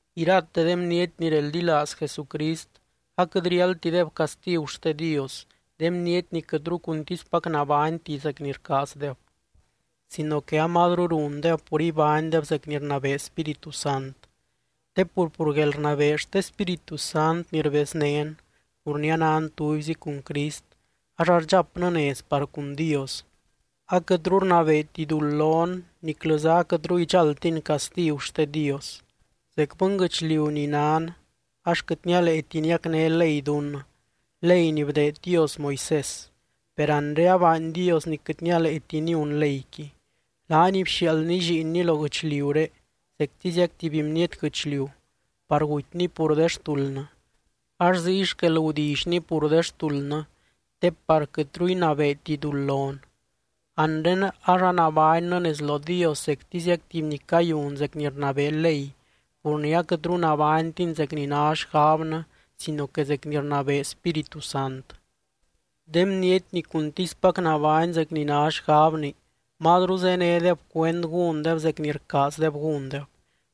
Irate de bniety ni reldilaaz Jesucrist aquɨt riáldtideb castigu xte Dios, de bniety ni quɨtru cuntispac nabányti zec ni rcaazdeb, sino que amazru rundeb pur ibánydeb zec ni rnabee Spíritu Sant. Te pur, pur guelrnabee xte Spíritu Sant ni rbeznén pur ni anan tubyzi cun Crist, ax ardxapnɨ nez par cun Dios, aquɨtru rnabeeti duld lon niclɨza aquɨtru idxáldtin castigu xte Dios. Zec bɨnguɨchliu ni nan ax quɨt nialeeti niacné ley dunnɨ, ley ni bdeed Dios Moisés. Per anre abaany Dios ni quɨt nialeeti niun leyqui. Laany bxiaaldny Lliinny lo guɨchliuré zectiziac tuby bniety guɨchliu par gutyny pur de xtuldnɨ, ax ziy xquel gudillyny pur de xtuldnɨ te par quɨtru inabeeti duld lon. Anre ax anabánnɨ nez lo Dios zectiziac tuby ni cayun zec ni rnabee ley pur ni aquɨtru nabánytin zec ni ná xgabnɨ sino que zec ni rnabee Spíritu Sant. De bniety ni cuntispac nabány zec ni ná xgabni, mazru zénedeb cuend gúndeb zec ni rcaazdeb gúndeb.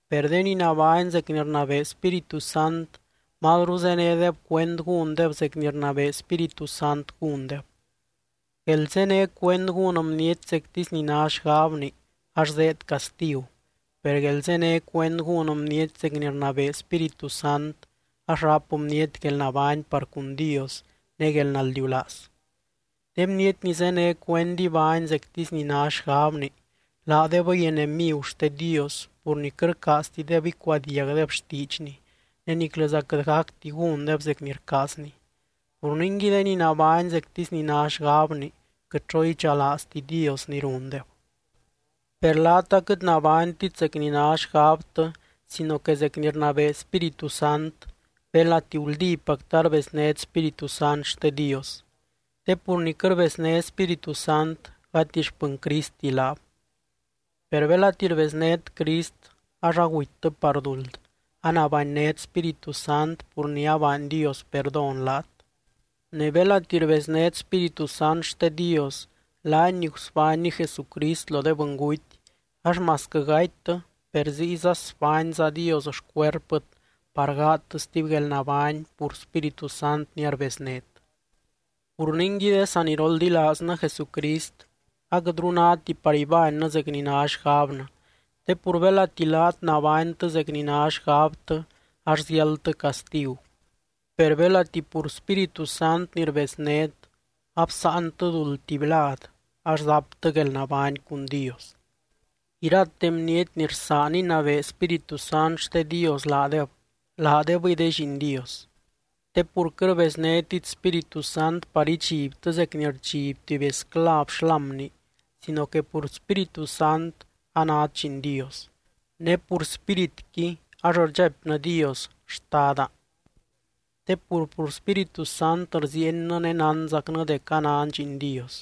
Per de ni nabány zec ni rnabee Spíritu Sant, mazru zénedeb cuend gúndeb zec ni rnabee Spíritu Sant gúndeb. Guelzené cuend gún bniety zectisy ni ná xgabni ax zéed castigu. Per guelzené cuend gún bniety zec ni rnabee Spíritu Sant ax ráp bniety guelnabány par cun Dios ne guelnaldiulaaz. De bniety ni zéne cuend ibány zectisy ni ná xgabni, laadebɨy enemigu xte Dios pur ni quɨt rcaaztideb icuadiagdeb xtiidxny ne niclɨza quɨt gacti gúndeb zec ni rcaazny. Pur ningui de ni nabány zectisy ni ná xgabni, quɨt xo idxalaazti Dios ni rundeb. Per laat aquɨt nabánytit zec ni ná xgabtɨ sino que zec ni rnabee Spíritu Sant, belati guldípactɨ arbeznét Spíritu Sant xte Dios. Te pur ni quɨt rbezné Spíritu Sant, gati xpɨny Cristti laab. Per belati rbeznét Crist, ax agutytɨ par duld, anabanynét Spíritu Sant pur ni abaany Dios perdón laat. Ne belati rbeznét Spíritu Sant xte Dios, laany ni gusbánny Jesucrist lo de bɨnguty ax masquɨ gatytɨ per ziyza sbányza Dios xcuerpɨt par gaadtɨ stuby guelnabány pur Spíritu Sant ni arbeznét. Pur ningui de saniroldilaaznɨ Jesucrist, aquɨtru náti par ibánnɨ zec ni ná xgabnɨ. Te pur belati laat nabánytɨ zec ni ná xgabtɨ ax ziáldtɨ castigu, per belati pur Spíritu Sant ni rbeznét absáantɨ duld tuby lad ax zaptɨ guelnabány cun Dios. Irate bniety ni rsaan inabee Spíritu Sant xte Dios laadeb, laadebɨy de lliin Dios. Te pur quɨt rbeznétit Spíritu Sant par idxibtɨ zec ni rdxiby tuby esclav xlámni sino que pur Spíritu Sant, anát lliin Dios. Ne pur Spíritqui ax rdxaipnɨ Dios “¡Xtada!” Te pur, pur Spíritu Sant rziiennɨ ne nánzacnɨ dec anan lliin Dios.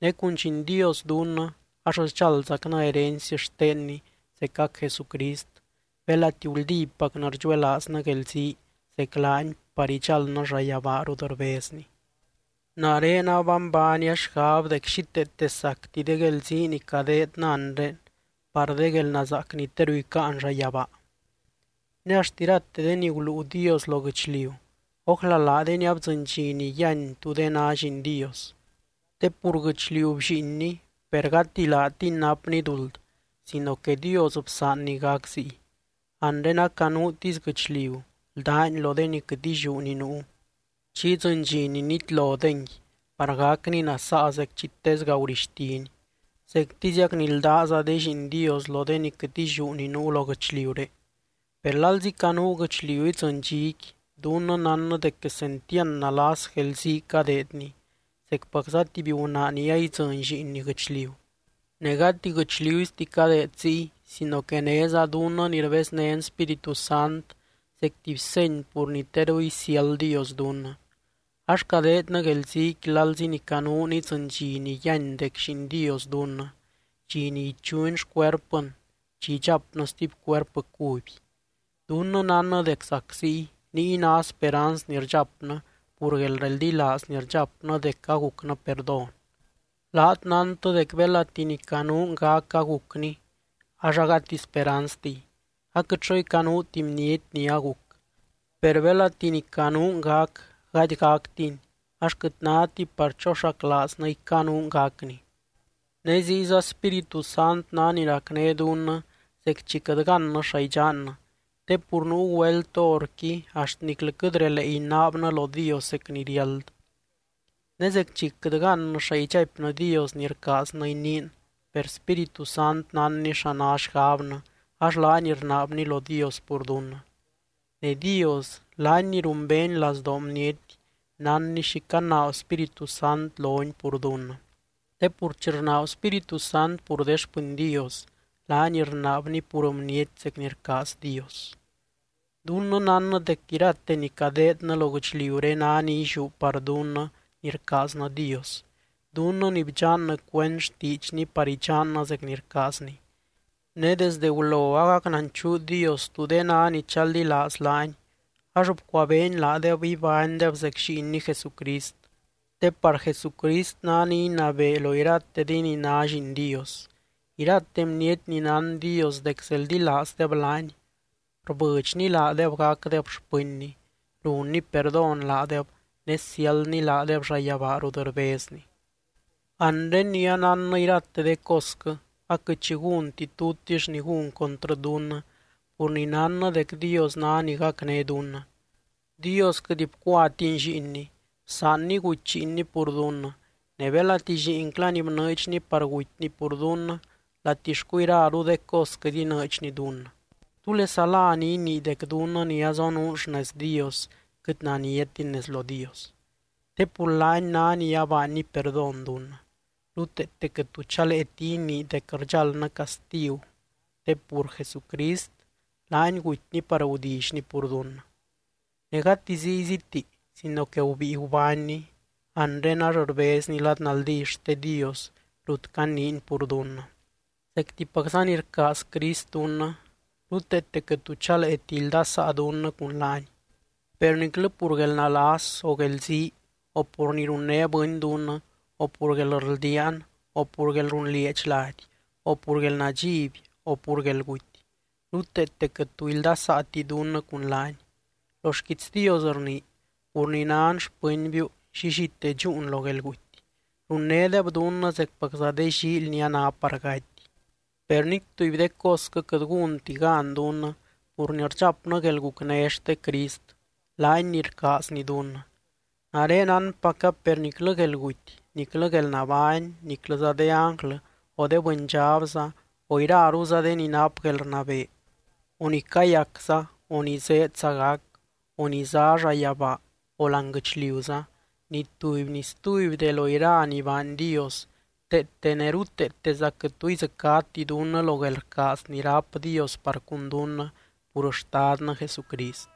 Ne cun lliin Dios dunnɨ ax sdxáldzacnɨ herency xtenny zecac Jesucrist, belati guldípacnɨ rdxuelaaznɨ guelzii zec laany par idxáldnɨ llayabaa rut rbezny. Nare abanbaania xgab dec xíteete sacti de guelzii ni cadeednɨ anre par de guelnazaac ni teru icáan llayabaa. Ne axt irate de ni guluu Dios lo guɨchliu ójla laadeni abdzɨny dxi ni yíany tú de ná lliin Dios. Te pur guɨchliu bllíinni, per gati laatini napni duld sino que Dios bsaanny gac ziy. Anre acanuutisy guɨchliu ldáni lo de ni quɨt illiú ni nuu, chi idzɨny dxi ni nitlodengui par gacni nasaa zec chi tesga gurixtini, zectiziac ni ldáza de lliin Dios lo de ni quɨt illiú ni nuu lo guɨchliuré. Per lalzi canuu guɨchliu idzɨny dxiqui, dunnɨ nánnɨ dec quesentiand nalas guelzii cadeedni, zecpacza tuby gunaa ni aidzɨny lliinni guɨchliu. Ne gati guɨchliusti cadeed ziy sino que néza dunnɨ ni rbeznén Spíritu Sant zec tuby seny pur ni teru isiáld Dios dunnɨ. Ax cadeednɨ guelziiqui lalzi ni canuun idzɨny dxi ni yíany dec lliin Dios dunnɨ, dxi ni ichuny xcuerpɨn chi idxapnɨ stuby cuerpɨ cuby. Dunnɨ nánnɨ dec zac ziy, niy ná speranz ni rdxapnɨ pur guelreldilaaz ni rdxapnɨ dec agucnɨ perdón. Laat nántɨ dec belati ni canuun gac agucni ax agati speranztiy, aquɨt xo icanuuti bniety ni aguc. Per belati ni canuun gac gady gactini ax quɨt náti par choxaclaaznɨ icanuun gacni. Ne ziyza Spíritu Sant ná ni racné dunnɨ zec chi quɨt gannɨ xa idxannɨ, te pur nuu güelt horqui axt niclɨ quɨt relee inaabnɨ lo Dios zec ni riáld. Ne zec chi quɨt gannɨ xa idxaipnɨ Dios ni rcaaznɨ iniin per Spíritu Sant nánny xa ná xgabnɨ, ax laany rnaabny lo Dios pur dunnɨ. Ne Dios, laany ni rumbeeny lazdoo bniety nánny xi canaab Spíritu Sant lony pur dunnɨ. Te pur chi rnaab Spíritu Sant pur de xpɨny Dios, laany rnaabny pur bniety zec ni rcaaz Dios. Dunnɨ nánnɨ dec irate ni cadeednɨ lo guɨchliuré ná ni illiú par dunnɨ ni rcaaznɨ Dios, dunnɨ ni bdxannɨ cuend xtiidxny par idxannɨ zec ni rcaazny. Ne desdɨ gulo agac nanchuu Dios tú de ná ni chaldilaaz laany ax bcuabeeny laadeb ibánydeb zec Lliinny Jesucrist, te par Jesucrist ná ni inabee lo irate de ni ná lliin Dios. Irate bniety ni nán Dios dec zeldilaazdeb laany, rbɨdxny laadeb gacdeb xpɨnny, runny perdón laadeb ne siáldny laadeb llayabaa rut rbezny. Anre ni anánnɨ irate de cosquɨ, aquɨt xi gúnti tutix ni gún contrɨ dunnɨ pur ni nánnɨ dec Dios ná ni gacné dunnɨ. Dios quɨt bcuatiny Lliinny, bsaanny guty Lliinny pur dunnɨ. Ne belati Lliinclany bnɨɨdxny par gutyny pur dunnɨ, ¿latixcu iraru de cos quɨt inɨɨdxny dunnɨ? ¿Túlesa lá ni inii dec dunnɨ ni azonuun xnez Dios quɨt naniatin nez lo Dios? Te pur laany ná ni abaanny perdón dunnɨ. Ruteete quɨt tu chaleeti inii dec rdxáldnɨ castigu te pur Jesucrist, laany gutyny par gudillyny pur dunnɨ. Ne gati zíyziti sino que gubíi gubánny, anre ax rbezny lad naldí xte Dios rut caniiny pur dunnɨ. Zectipacza ni rcaaz Crist dunnɨ, ruteete quɨt tu chaleeti ildasaa dunnɨ cun laany. Per niclɨ pur guelnalas, o guelzii, o pur ni runné bɨny dunnɨ, o pur guelrldiaan, o pur guelrunlieedx lady, o pur guelnadxiby o pur guelguty, ruteete quɨt tu ildasaati dunnɨ cun laany. Lo xquiits Dios rnii: Pur ni nan xpɨnbiu, llillite dxúun lo guelguty. Runnédeb dunnɨ zecpacza de llíily ni a ná par gaty. Per nic tuby de cosquɨ quɨt gúnti gan dunnɨ pur ni rdxapnɨ guelgucné xte Crist, laany ni rcaazny dunnɨ. Nare nánpaca per niclɨ guelguty, niclɨ guelnabány, niclɨza de ánglɨ, o de bɨndxabza, o iraruza de ni nap guelrnabee, o ni cayacza, o ni zéedza gac, o ni zá llayabaa, o láani guɨchliuza, ni tuby ni stuby de lo iraru ni baany Dios, teete ne ruteeteza quɨt tu idzɨcáti dunnɨ lo guelrcaaz ni ráp Dios par cun dunnɨ pur Xtadnɨ Jesucrist.